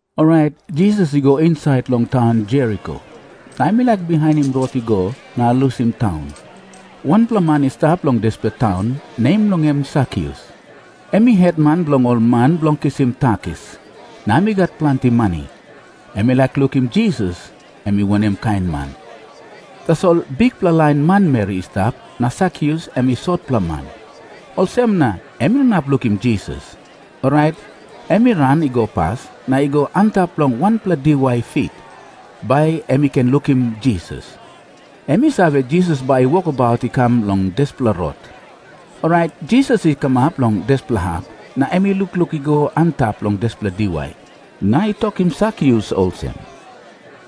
Orait Jisas i go insait long taun Jeriko, na em i laik bihainim rot i go na lusim taun. Wanpela man i stap long dispela taun, nem bilong en Sakius. Em i hetman bilong ol man bilong kisim takis, na em i gat planti mani. Em i laik lukim Jisas em i wanem kain man. Tasol bikpela lain manmeri i stap, na Sakius em i sotpela man. Olsem na em i no inap lukim Jisas. Orait em i ran i go pas, na i go antap long wanpela diwai fik, bai em i ken lukim Jisas. Em i save, Jisas bai i wokabaut i kam long dispela rot. Orait Jisas i kamap long dispela hap, na em i lukluk i go antap long dispela diwai, na i tokim Sakius olsem,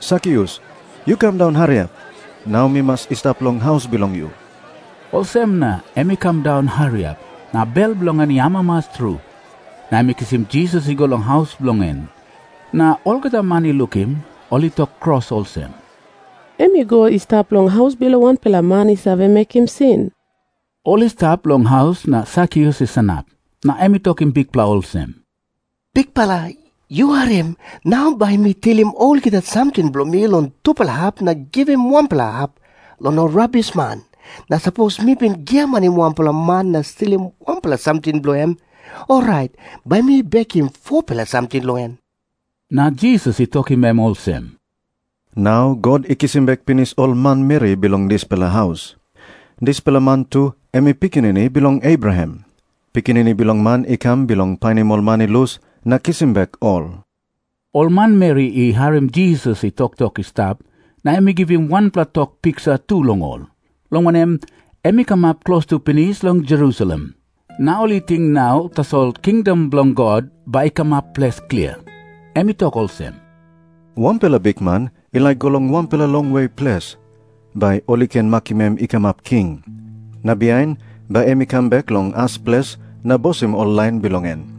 "Sakius, yu kam daun hariap. Nau mi mas i stap long haus bilong yu." Olsem na em i kam daun hariap, na bel bilong en i amamas tru, na em i kisim Jisas i go long haus bilong en. Na olgeta man i lukim, ol i tok kros olsem, "Em i go i stap long haus bilong wanpela man i save mekim sin." Ol i stap long haus na Sakius i sanap, na em i tokim Bikpela olsem, "Bikpela, yu harim. Nau bai mi tilim olgeta samting bilong mi long tupela hap na givim wanpela hap long ol rabisman. Na sapos mi bin giamanim wanpela man na stilim wanpela samting bilong en, orait bai mi bekim 4-pela samting long en." Na Jisas i tokim em olsem, "Nau God i kisim bek pinis ol manmeri bilong dispela haus. Dispela man tu em i pikinini bilong Abraham. Pikinini Bilong Man i kam bilong painim ol man i lus na kisim bek ol." Ol manmeri i harim Jisas i toktok i stap, na em i givim wanpela tok piksa tu long ol, long wanem, em i kamap klostu pinis long Jerusalem, na ol i ting nau tasol kingdom bilong God bai i kamap ples klia. Em i tok olsem, "Wanpela bikman i laik i go long wanpela longwe ples, bai ol i ken makim em i kamap king. Na bihain bai em i kam bek long as ples na bosim ol lain bilong en.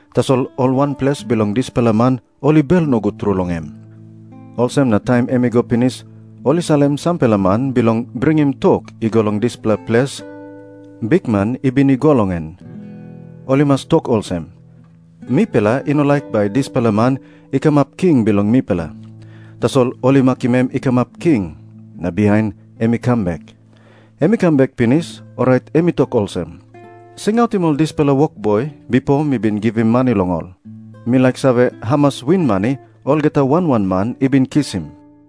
"Tasol ol wanples bilong dispela man ol i bel nogut tru long em. Olsem na taim em i go pinis ol i salim sampela man bilong bringim tok i go long dispela ples bikman i bin i go long en. Ol i mas tok olsem, 'Mipela i no laik bai dispela man i kamap king bilong mipela.' Tasol ol i makim em i kamap king, na bihain em i kam bek. Em i kam bek pinis, orait em i tok olsem, 'Singautim ol dispela wokboi bipo mi bin givim mani long ol. Mi laik save hamas winmani olgeta wan wan man i bin kisim.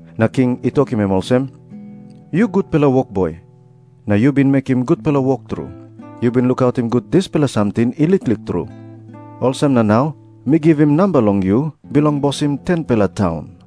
Na king i tokim em olsem, 'Yu gutpela wokboi, na yu bin mekim gutpela wok tru. Yu bin lukautim gut dispela samting i liklik tru, olsem na nau mi givim namba long yu bilong bosim 10-pela taun.'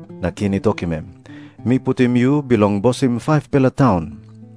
Na king i tokim em, 'Mi putim yu bilong bosim 5-pela taun.'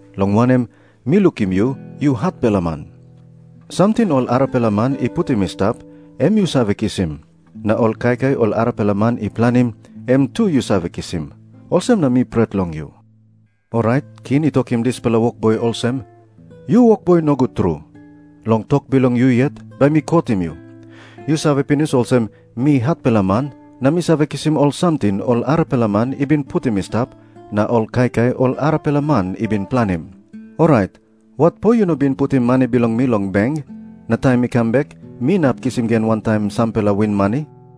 long wanem, mi lukim yu, yu hatpela man. Samting ol arapela man i putim i stap, em yu save kisim. Na ol kaikai ol arapela man i planim, em tu yu save kisim. Olsem na mi pret long yu.' "Orait king i tokim dispela wokboi olsem, 'Yu wokboi nogut tru! Long tok bilong yu yet bai mi kotim yu. Yu save pinis olsem, mi hatpela man, na mi save kisim ol samting ol arapela man i bin putim i stap na ol kaikai ol arapela man i bin planim. Orait watpo yu no bin putim mani bilong mi long beng, na taim mi kam bek mi inap kisim gen wantaim sampela winmani?'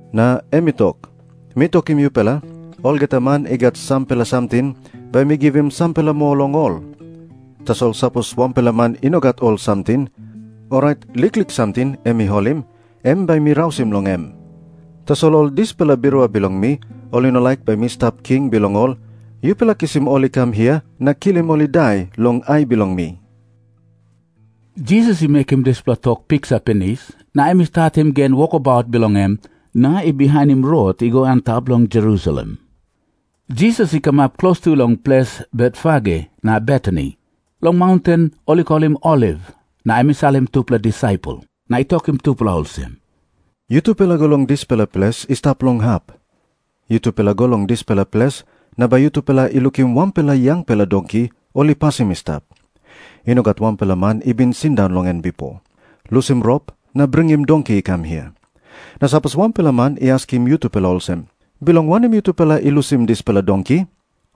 "Na em i tok, 'Mi tokim yupela, olgeta man i gat sampela samting, bai mi givim sampela moa long ol. Tasol sapos wanpela man i no gat ol samting, orait liklik samting em i holim, em bai mi rausim long em. Tasol ol dispela birua bilong mi, ol i no laik bai mi stap king bilong ol, yupela kisim ol i kam hia na kilim ol i dai long ai bilong mi.'" Jisas i mekim dispela tok piksa pinis, na em i statim gen wokabaut bilong en, na i bihainim rot i go antap long Jerusalem Jisas i kamap klostu long ples Betfage na Betani, long maunten ol i kolim Oliv, na em i salim tupela disaipel na i tokim tupela olsem, "Yutupela go long dispela ples i stap long hap. Yutupela go long dispela ples, na bai yutupela i lukim wanpela yangpela donki ol i pasim i stap. I no gat wanpela man i bin sindaun long en bipo. Lusim rop na bringim donki i kam hia. Na sapos wanpela man i askim yutupela olsem, 'Bilong wanem yutupela i lusim dispela donki?',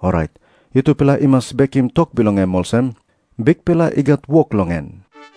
orait yutupela i mas bekim tok bilong em olsem, 'Bikpela i gat wok long en.'"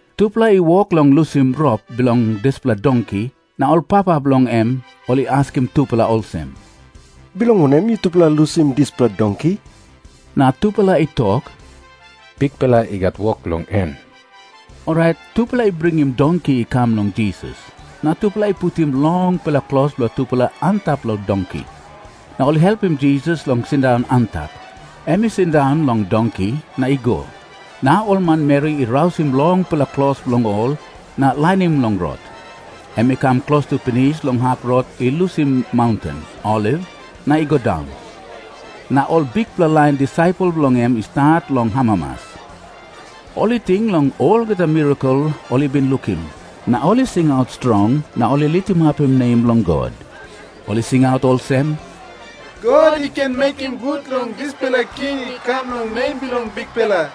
Tupela i wok long lusim rop bilong dispela donki, na ol papa bilong en ol i askim tupela olsem, "Bilong wanem yutupela i lusim dispela donki?" Na tupela i tok, "Bikpela i gat wok long en Orait tupela i bringim donki i kam long Jisas. Na tupela i putim longpela klos bilong tupela antap long donki. Na ol i helpim Jisas long sindaun antap. Em i sindaun long donki na i go, na ol manmeri i rausim longpela klos bilong ol na lainim long rot. Em i kam klostu pinis long hap rot i lusim maunten Oliv na i go daun. Na ol bikpela lain disaipel bilong en i stat long amamas. Ol i ting long olgeta mirakel ol i bin lukim, na ol i singaut strong, na ol i litimapim nem bilong God. Ol i singaut olsem, "God i ken mekim gut long dispela king i kam long nem bilong Bikpela.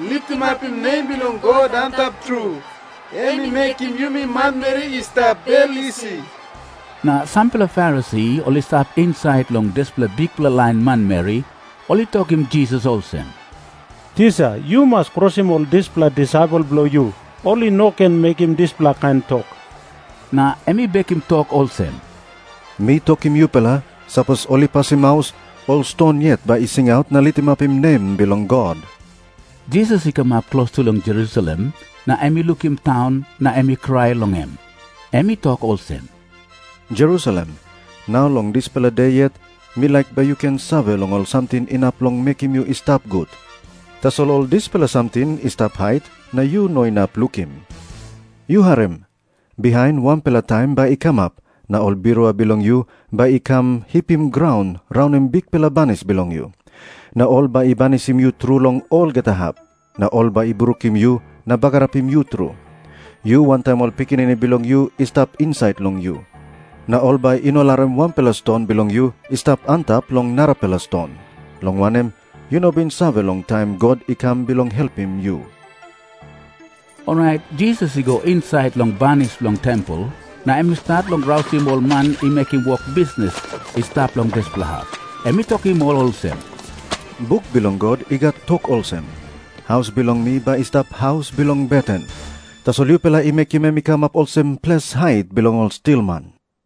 Litimapim nem bilong God Antap Tru! Em i mekim yumi manmeri i stap bel isi." Na sampela Farisi ol i stap insait long dispela bikpela lain manmeri, ol i tokim Jisas olsem, "Tisa, yu mas krosim ol dispela disaipel bilong yu. Ol i no ken mekim dispela kain tok." Na em i bekim tok olsem "Mi tokim yupela, sapos ol i pasim maus, ol ston yet bai i singaut na litimapim nem bilong God." Jisas i kamap klostu long Jerusalem, na em i lukim taun, na em i krai long em. Em i tok olsem, "Jerusalem, nau long dispela de yet mi laik bai yu ken save long ol samting inap long mekim yu i stap gut. Tasol ol dispela samting i stap hait, na yu no inap lukim. Yu harim. Bihain wanpela taim bai i kamap, na ol birua bilong yu bai i kam hipim graun raunim bikpela banis bilong yu. Na ol bai i banisim yu tru long olgeta hap. Na ol bai i brukim yu na bagarapim yu tru, yu wantaim ol pikinini bilong yu i stap insait long yu. Na ol bai i no larim wanpela ston bilong yu i stap antap long narapela ston, long wanem, yu no bin save long taim God i kam bilong helpim yu." Orait Jisas i go insait long banis bilong tempel, na em i stat long rausim ol man i mekim wok bisnis i stap long dispela hap. Em i tokim ol olsem, "Buk bilong God i gat tok olsem, 'Haus bilong mi bai i stap haus bilong beten.' Tasol yupela i mekim em i kamap olsem ples hait bilong ol stilman."